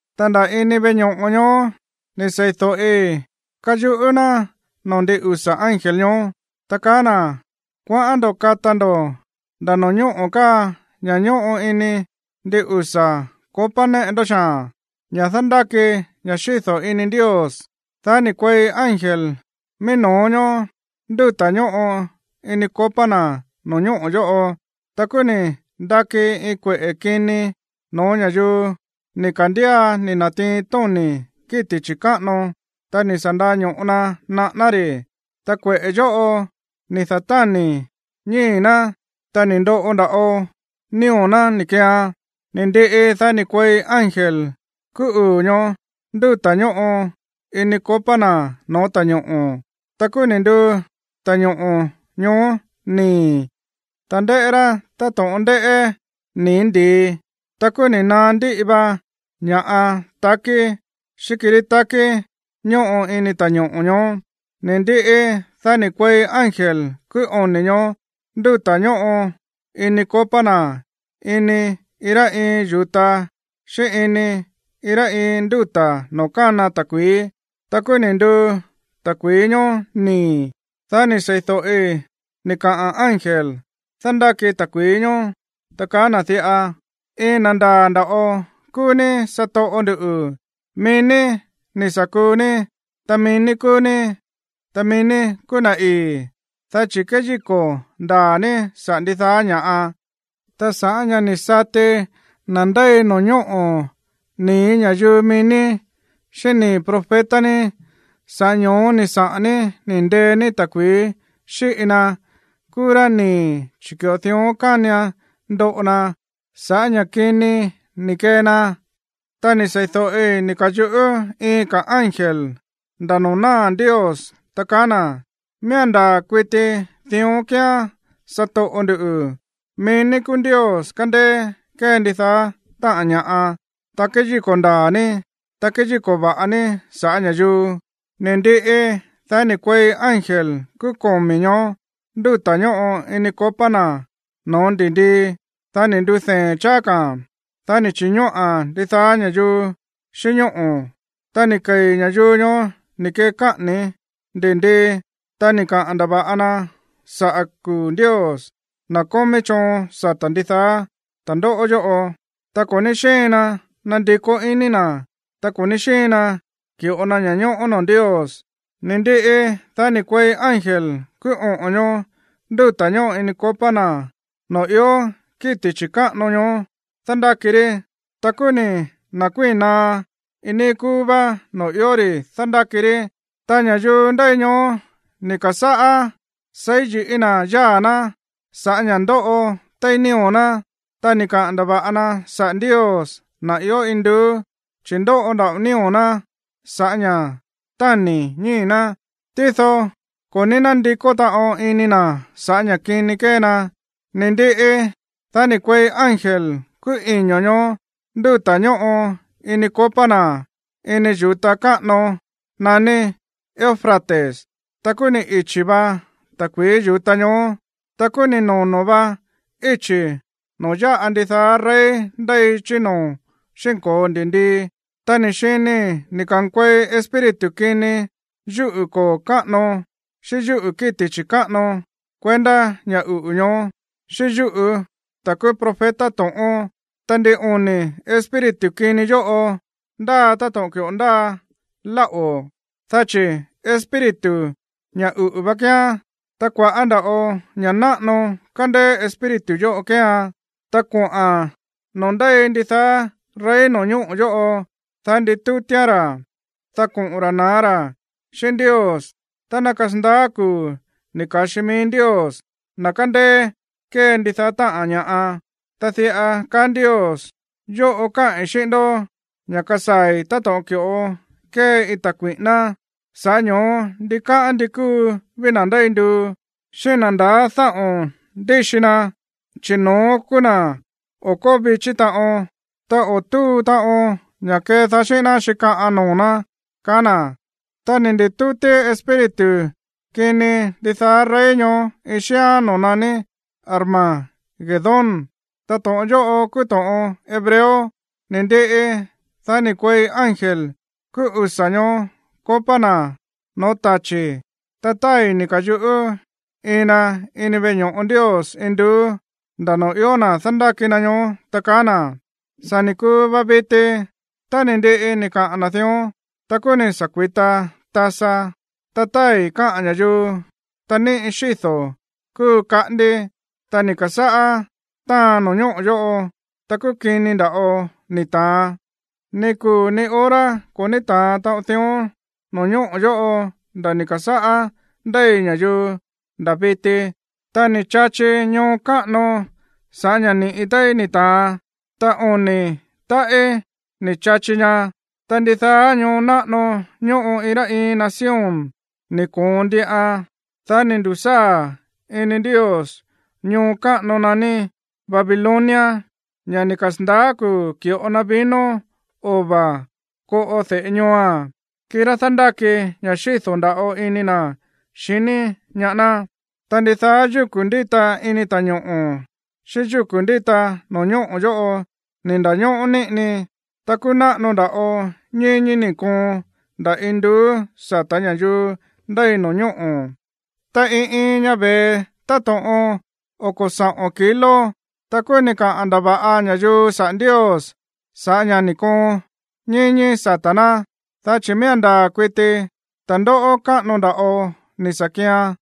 Ta nda̱ ini veꞌe ño̱ꞌo ñoó ni̱ sei̱do̱ꞌi káyuꞌú ná noo̱ ndin usa̱ ángel ñoó, ta kaá na̱: ―Kuaꞌán ndo̱ kata ndo̱ nda̱ no̱ñóꞌo̱ káa ña̱ ñóꞌo ini ndin usa̱ copa néꞌe ndó xaa̱n, ña̱ dándáki ña̱ xído̱ ini Ndios. Dá ni̱ kuei ángel mií no̱ó ñoó ndúta̱ ñóꞌo ini copa na̱ no̱ñóꞌo̱ yóꞌo, ta kúú ni̱ ndaki iin kueꞌe̱ kini no̱ó ña̱yuu ni̱ ka̱ndía ni̱ na̱tiin tóni̱ kíti̱ chi̱káꞌano, ta ni̱ sa̱ ndaño̱ꞌo na naꞌáná ri̱. Ta kueꞌe̱ yóꞌo ni̱ da̱táni̱ ñii̱ ná, ta ni̱ ndoꞌo nda̱ꞌo nío̱ ná ni̱ keean. Ni̱ ndiꞌi, dá ni̱ kuei ángel kúú uu̱ ñoó ndúta̱ ñóꞌo ini copa na̱ no̱ó ta̱ñoꞌo̱. Ta kúú ni̱ nduu ta̱ñoꞌo̱ ñoó nii̱, ta ndéꞌé rá táto̱ꞌon ndéꞌé nii̱ ndi̱i. Ta kúú ni̱ naá ndíꞌi va ña̱ꞌa takí xíꞌín kirí takí ñóꞌo ini ta̱ñoꞌo̱ ñoó. Ni̱ ndiꞌi, dá ni̱ kuei ángel kúú oni̱ ñoó ndúta̱ ñóꞌo ini copa na̱ ini iin rá iin yu̱ta xíꞌín ini iin rá iin ndúta̱ noo̱ kána ta̱kui̱í. Ta kúú ni̱ nduu ta̱kui̱í ñoó nii̱. Dá ni̱ sei̱do̱ꞌi ni̱ kaꞌa̱n ángel dándáki ta̱kui̱í ñoó, ta kaá na̱ diꞌa: ―Iin na̱ ndaa̱ nda̱ꞌo kúú ní, satoꞌo ndu̱, mií ní ni̱ sa̱ kuu ní, ta mií ní kúú ní, ta mií ní kúú na̱ ii̱, dá chi̱ kéyíko̱ ndaa̱ ní saꞌa̱ ndidaá ña̱ꞌa, ta sa̱ꞌá ña̱ ni̱ sati na̱ ndéi no̱ñóꞌo̱ nii̱ ña̱yuu mií ní, xíꞌín nii̱ profeta ní, sa̱ꞌá ño̱ó ni̱ saꞌa̱n ní ni̱ ndee ní ta̱kui̱í xíꞌi na kúú rá nii̱, chi̱ ki̱ꞌo dión kánian ndoꞌo na sa̱ꞌá ña̱ kini ni̱ kee na. Ta ni̱ sei̱do̱ꞌi ni̱ ka̱yuꞌú iin ka̱ ángel nda̱ noo̱ náa̱ Ndios, ta kaá na̱: ―Miía̱n ndaa̱ kuiti dión kíán, satoꞌo ndu̱, mií ní kúú Ndios kándéé kée ndidaá táꞌa̱n ña̱ꞌa, ta kéyíko̱ ndaa̱ ní, ta kéyíko̱ va̱ꞌa ní sa̱ꞌá ña̱yuu. Ni̱ ndiꞌi, dá ni̱ kuei ángel kúú komi̱ ñoó ndúta̱ ñóꞌo ini copa na̱ no̱ó ndi̱ndii, dá ni̱ ndudee̱n cháá ka̱a̱n, dá ni̱ chi̱ñóꞌa̱n ndidaá ña̱yuu xíꞌín ñóꞌo̱. Ta ni̱ kei̱ ña̱yuu ñoó ni̱ kee káꞌa̱ni̱ ndi̱ndii, ta ni̱ kaꞌa̱n ndava̱ꞌa na sa̱ꞌá kuu̱ Ndios, na̱ kómí choon sata̱ ndidaá ta̱ndóꞌó yóꞌo, ta ko̱ ní xíin na nandikó iní na̱, ta ko̱ ní xíin na ki̱ꞌo na ña̱ñóꞌó noo̱ Ndios. Ni̱ ndiꞌi, dá ni̱ kuei ángel kúú oꞌo̱n ñoó ndúta̱ ñóꞌo ini copa na̱ noo̱ ió kíti̱ chi̱káꞌano ñoó dándáki rí. Ta kúú ni̱ na̱kuíi̱n naá iin níí kúú vá noo̱ ió ri̱ dándáki rí. Ta ña̱yuu ndéi ñoó ni̱ ka̱sáꞌá seí yi̱ꞌí na̱ yáa̱ ná sa̱ꞌá ña̱ ndóꞌo téí nío̱ ná, ta ni̱ kaꞌa̱n ndava̱ꞌa na saꞌa̱ Ndios, na̱ ió induú, chi̱ ndóꞌo nda̱ꞌo nío̱ ná sa̱ꞌá ña̱ táni̱ ñíi̱ ná. Tído ko̱ ní nándikó taꞌon iní na̱ sa̱ꞌá ña̱ kini kée na. Ni̱ ndiꞌi, dá ni̱ kuei ángel kúú iño̱ ñoó ndúta̱ ñóꞌo ini copa na̱ ini yu̱ta káꞌano naní Eufrates, ta kúú ni̱ ichi̱ va ta̱kui̱í yu̱ta ñoó. Ta kúú ni̱ nono̱ vá íchi̱ noo̱ ya̱ꞌa ndidaá rey ndéi chí noo̱ xi̱nko̱o ndi̱ndii. Ta ni̱ xinii̱ ni̱ ka̱nkuei espíritu kini yúꞌu̱ koo̱ káꞌano xíꞌín yúꞌu̱ kíti̱ chi̱káꞌano kuendá ña̱ uꞌu̱ ñoó, xíꞌín yúꞌu̱ ta̱ kúú profeta to̱ꞌón. Ta ndin oni̱ espíritu kini yóꞌo ndáa táto̱ꞌon ki̱ꞌo ndáa láꞌo̱, dá chi̱ espíritu ña̱ uꞌu̱ vá kíán, ta kua̱ꞌá nda̱ꞌo ña̱ náꞌano kándéé espíritu yóꞌo kéean. Ta koꞌa̱n noo̱ ndéi ndidaá rey no̱ñóꞌo̱ yóꞌo, dá nditútíán ra̱, dá koꞌo̱n ra̱ na̱á ra̱ xíꞌín Ndios tá ná kasandaá kuu̱ ni̱ ka̱xi mií Ndios, na̱ kándéé kée ndidaá táꞌa̱n ña̱ꞌa. Ta diꞌa kaá Ndios: “Yóꞌo káꞌi̱n xíꞌín ndó ña̱ kasaa̱i̱ táto̱ꞌon ki̱ꞌo kée iin ta̱ kui̱ꞌíná. Sa̱ꞌá ño̱ó ndikáꞌán ndi kúu ví na̱ ndéi nduu, xíꞌín na̱ ndaá dáꞌo̱n ndíxi na, chi̱ no̱ón kúú na̱ o̱ kóo vichí taꞌon, ta o̱ túu taꞌon ña̱ kedaá xíꞌín ná xíkaꞌan noo̱ ná”, kaá na̱. Ta ni̱ ndi̱tútí espíritu kini ndidaá rey ñoó iin xíán noo̱ naní Armagedón, ta to̱ꞌon yóꞌo kúú to̱ꞌon hebreo. Ni̱ ndiꞌi, dá ni̱ kuei ángel kúú usa̱ ñoó copa na̱ no̱ó tachi̱, ta tái̱ ni̱ ka̱yuꞌú iin na ini veꞌe ño̱ꞌo Ndios induú, nda̱ noo̱ ió na̱ dándáki na ñoó, ta kaá na̱: ―Sa̱ ni̱ kuu va viti. Tá ni̱ ndiꞌi ni̱ kaꞌa̱n na̱ dión, ta kúú ni̱ sa̱ kui̱ta tasa, ta tái̱ káꞌa̱n ña̱yuu, ta níꞌi xído̱ kúu kaꞌandi. Ta ni̱ ka̱sáꞌá táan no̱ñóꞌo̱ yóꞌo, ta kúú kini nda̱ꞌo ni̱ ta̱an. Ni kuu̱ ni hora ko̱ ní ta̱an taꞌon dión no̱ñóꞌo̱ yóꞌo nda̱ ni̱ ka̱sáꞌá ndéi ña̱yuu nda̱ viti. Ta ni̱ chachi ñoo káꞌano sa̱ꞌá ña̱ ni̱ꞌi téí ni̱ ta̱an, ta oni̱ táꞌí ni̱ chachi ña. Ta ndidaá ñoo náꞌano ñóꞌo iin rá iin nación ni̱ koon ndiꞌan. Dá ni̱ ndu̱sáa̱ ini Ndios ñoo káꞌano naní Babilonia, ña̱ ni̱ kasa̱ndaá kuu̱ ki̱ꞌo na vino ova̱ koꞌo de̱ꞌe ñooa̱n, kirá dándáki ña̱ xído̱ nda̱ꞌo ini na̱ xiní ñaá ná. Ta ndidaá yúku̱ ndíta ini ta̱ñoꞌo̱ xíꞌín yúku̱ ndíta no̱ñóꞌo̱ yóꞌo ni̱ nda̱ñóꞌó níꞌini. Ta kúú náꞌano nda̱ꞌo ñíñí ni̱ koon nda̱ induú sa̱tá ña̱yuu ndéi no̱ñóꞌo̱, ta iin iin ña ve̱e táto̱ꞌon oko̱ saꞌo̱n kilo. Ta kúú ni̱ kaꞌa̱n ndava̱ꞌa ña̱yuu saꞌa̱ Ndios sa̱ꞌá ña̱ ni̱ koon ñíñí sata̱ ná, dá chi̱ miía̱n ndaa̱ kuiti ta̱ndóꞌó káꞌano nda̱ꞌo ni̱ sa̱ kian.